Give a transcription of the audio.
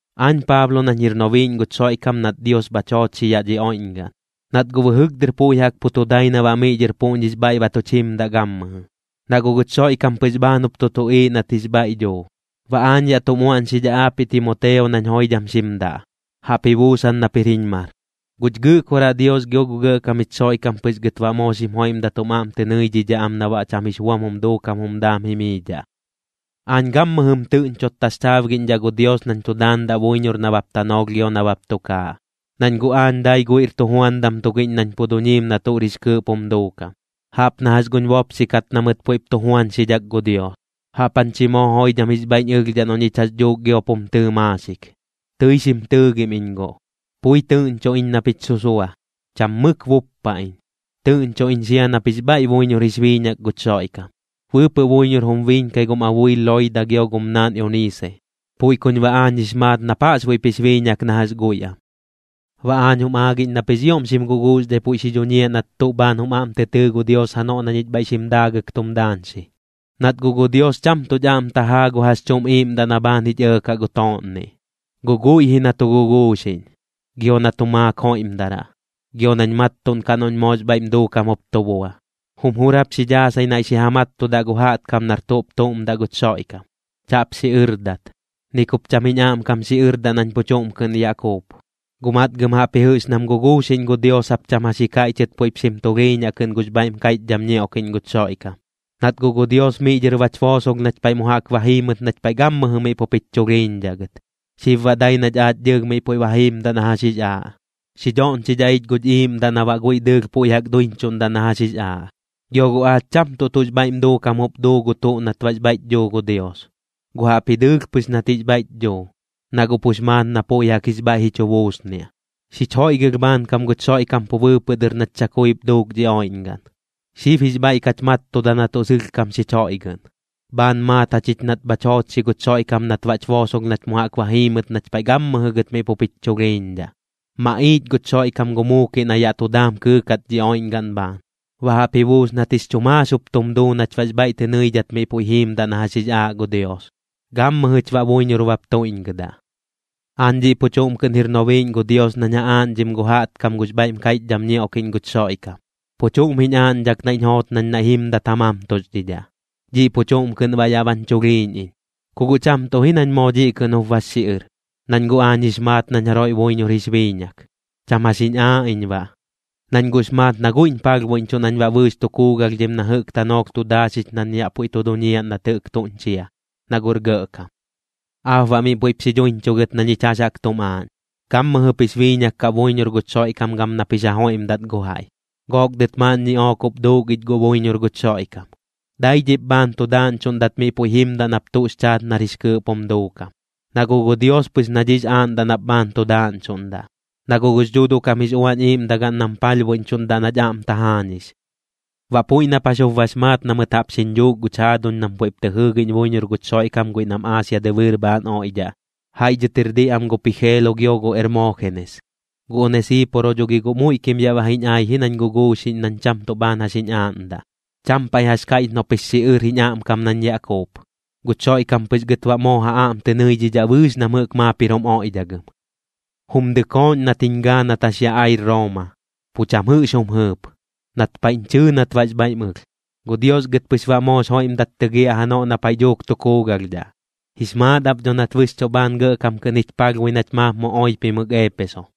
Aañ Paablo nañ jir nobiiꞌñ guch Xoiꞌkam nat Dios bhach joochxi yaꞌ dhi oiꞌñgaꞌn, nat guꞌ bɨjɨk dɨr puiꞌ jaꞌk pu tu dai na baꞌ miꞌ dhɨr puꞌñix bhaiꞌ ba tuch jimdaꞌ gammɨjɨ, na guꞌ guch Xoiꞌkam pɨx bhaan jup tu tuꞌiiꞌ nat jix bhaiꞌ dhuu. Baꞌ aañ yaꞌ tum uaꞌñxidhaꞌ aapiꞌ Timoteo nañ joidham xim daꞌ, jaꞌp ji buusan nap jir jiñ mar. Guch Gɨꞌkoraꞌ Dios gio gu Gɇꞌkam jich Xoiꞌkam pɨx gɨt baꞌ moo xim joiꞌmdat jum aꞌm tɨ nɨidhidhaꞌ am na baꞌ cham jix buam jum duukam jum daam jimiidhaꞌ. Aañ gammɨjɨm tɨꞌñchot taxchaabgiꞌñdhaꞌ gu Dios nañ tu daandaꞌ buiñor nabap tanoolh gio nabap tukaaꞌ, nañ guꞌ aañ dai guiꞌr tujuandam tugiꞌñ nañ pu duñiim na tuꞌr jix kɨɨꞌp jum duukam, jaꞌp na jax guñ bopxi kat na mɨt puiꞌp tu juañxidhak gu Dios. Jaꞌp jañ chi moo joidham jix bhaiꞌñ ɨlhdhaꞌ noꞌ ñich jax dhuuk giop jum tɨɨ maaxik, tɨi xim tɨɨgim iñ guꞌ. Pui tɨꞌñcho iñ na pich susua, cham mɨk buppa iñ. Tɨꞌñcho iñ sia nap jix bhaiꞌ buiñor jix biiñak guch Xoiꞌkam. Bɨɨpɨꞌ buiñor jum biiñkai gum abuil Loida gio gum naan Euniise, puiꞌ kuñ baꞌ aañ jix maat nap jaꞌxbuiꞌp jix biiñak na jax guiꞌ am. Baꞌ aañ jum aagiꞌñ nap jix ioꞌm xim guguuxdhai puiꞌ xi dhuñiaꞌ nat tuꞌ bhaan jum aꞌm tɨ tɨɨ gu Dios janoꞌ na ñich bhaiꞌ xim daagɨk tum daañxi. Nat guꞌ gu Dios cham tuꞌch aꞌm tajaa gu jax chuꞌm iiꞌmdaꞌ na bhaan jich ɇɇkaꞌ gu tooꞌnniꞌ, guꞌ guiꞌ ji na tu guguuxiꞌñ, gio na tu maak joiꞌmdaraꞌ, gio nañ mattuꞌnkaꞌ noꞌñ moox bhaiꞌm duukam jup tu bua. Jum jur jap xi dhaasai naiꞌ xi ja mattudaꞌ gu jaꞌtkam nar tuꞌp tuꞌm daꞌ guch Xoiꞌkam, chaꞌp xiꞌɨrdat. Ni kup cham jiñ aꞌmkam xiꞌɨrdaꞌ nañ pu chuꞌm kɨꞌn yaꞌ kuup, guꞌ matgɨm jaꞌpji jɨꞌx nam guguuxiꞌñ gu Dios jap cham jax ji kaiꞌchɨt puiꞌp xim tulhiiñaꞌ kɨꞌn gux bhaiꞌm kaiꞌchdham ñioꞌkiꞌñ guch Xoiꞌkam. Nat guꞌ gu Dios miꞌ dhɨr bach boosolh nach paiꞌ mu jaꞌk ba jiimɨt nach paiꞌ gammɨjɨ miꞌ pup jich chulhiiñdhaꞌ gɨt, xib baꞌ dai nach aach dɨɨlh miꞌ puiꞌ ba jiimdaꞌ na jax jix aaꞌ. Xi dhoꞌñchidhaꞌ ich guch iiꞌmdaꞌ na baꞌ guiꞌ dɨɨlh puiꞌ jaꞌk duiñchuꞌndaꞌ na jax jix aaꞌ. Gio guꞌ aach cham tuꞌ tuꞌx bhaiꞌm duukam jup duu gu tuꞌ nat baꞌx bhaiꞌch dhuu gu Dios, guꞌ jaꞌpji dɨɨlh pɨx nat jix bhaiꞌch dhuu, na guꞌ pux maat na puiꞌ jaꞌk jix bhaiꞌ ji chu buusniaꞌ. Xich joiꞌgɨlh bhaankam guch Xoiꞌkam pu bɨɨpɨꞌ dɨr nat chakuip duuk dhi oiꞌñgaꞌn. Xib jix bhaiꞌ kach mattuda na tuꞌ sɨlhkam xich joiꞌgɨꞌn, bhaan maat jachich nat bhach joochxi guch Xoiꞌkam nat baꞌch boosolh nach mu jaꞌk ba jiimɨt nach paiꞌ gammɨjɨ gɨt miꞌ pup jich chulhiiñdhaꞌ. Maꞌiich guch Xoiꞌkam gu muukiꞌ na yaꞌ tu daam kɨɨkat dhi oiꞌñgaꞌn bhaan. Baꞌ jaꞌp ji buus nat jix chu maax jup tum duu nach baꞌx bhaiꞌ tɨ nɨidhat miꞌ puiꞌ jiimdaꞌ na jax jix aaꞌ gu Dios, gammɨjɨch baꞌ buiñor bap tuiꞌñgɨdaꞌ. Aañ dhiꞌ pu chuꞌm kɨꞌn jir nobiiꞌñ gu Dios nañ ja aaꞌñdhim gu jaꞌtkam gux bhaiꞌm kaiꞌchdham ñioꞌkiꞌñ guch Xoiꞌkam, pu chuꞌm jiñ aaꞌñdhak naiꞌñ joot nañ naiꞌ jimdat ja mamtuxdhidhaꞌ. Dhiꞌ pu chuꞌm kɨꞌn baꞌ yaꞌ bañ chulhiiñ iñ. Ku guꞌ cham tuꞌ ji nañ moo dhiꞌ kɨꞌn jup bax xiꞌɨr, nañ guꞌ aañ jix maat nañ jaroiꞌ buiñor jix biiñak. Cham jax jiñ aaꞌ iñ baꞌ, nañ guꞌx maat na guiꞌñ palhbuiꞌñchuꞌ nañ baꞌ bɨɨx tu kuugalhdhim na jɨꞌk tanoolh tu daaxix nañ yaꞌ puiꞌ tu duñiaꞌ nat jɨꞌk tuñ chia, na guꞌr gɇꞌkam. Aap baꞌ miꞌ puiꞌp xi dhuiñchugɨt na ñich jax jaꞌk tum aaꞌñ. Gammɨjɨp jix biiñak kaꞌ buiñor guch Xoiꞌkam gam nap jix ja joiꞌmdat gu jaiꞌ, gook dɨt maaꞌn ñiꞌook jup duuk ich guꞌ buiñor guch Xoiꞌkam. Dai dhiꞌp bhaan tu daaꞌñchuꞌndat miꞌ puiꞌ jimdaꞌ nap tuꞌx chaat nar jix kɨɨꞌp jum duukam, na guꞌ gu Dios pɨx na dhiꞌx aaꞌndaꞌ nap bhaan tu daaꞌñchuꞌndaꞌ, na guꞌ gux Dhuuduꞌ kam jix Uañ Iiꞌmdagaꞌn nam palhbuiꞌñchuꞌndaꞌ nach aꞌm tajaañix. Baꞌ puiꞌ nap jax jup bax maat na mɨt jaꞌp xiñ dhuuk guch jaaduñ nam puiꞌ tɨip tɨ jɨɨgiꞌñ buiñor guch Xoiꞌkam guiꞌ nam Aasia dɨbɨɨr bhaan oiꞌdhaꞌ, jaiꞌ dhɨt jir diꞌ am gu Pijeelo gio gu Ermoojenes. Gu Onesiiporo dho gi guꞌ muiꞌkim yaꞌ ba ji ai ji nañ guguuxiꞌñ nañ cham tuꞌ bhaan jax jiñ aaꞌndaꞌ. Cham paiꞌ jax kaiꞌch noꞌp jix xiꞌɨr jiñ aꞌmkam nañ yaꞌ kuup. Guch Xoiꞌkam pɨx gɨt baꞌ moo ja aꞌm tɨ nɨidhidhaꞌ bɨɨx nam jɨꞌk maap jir jum oiꞌdhagɨm. Jum dɨkooꞌñ nat jiñ gaa nat jax yaꞌ ai Rooma, pu cham jɨꞌx jum jɨɨp. Nat paiꞌñ chɨɨ nat baꞌx bhaiꞌm ɨlh. Gu Dios gɨt pɨx baꞌ moox joiꞌmdat tɨgiaꞌ janoꞌ na paiꞌ dhuuk tu kuugalhdhaꞌ. Jix maat ap dho nat bɨxchuꞌ bhaan gɇꞌkam kɨꞌn jich palhbui nach maap mu oipimɨk Eepeso.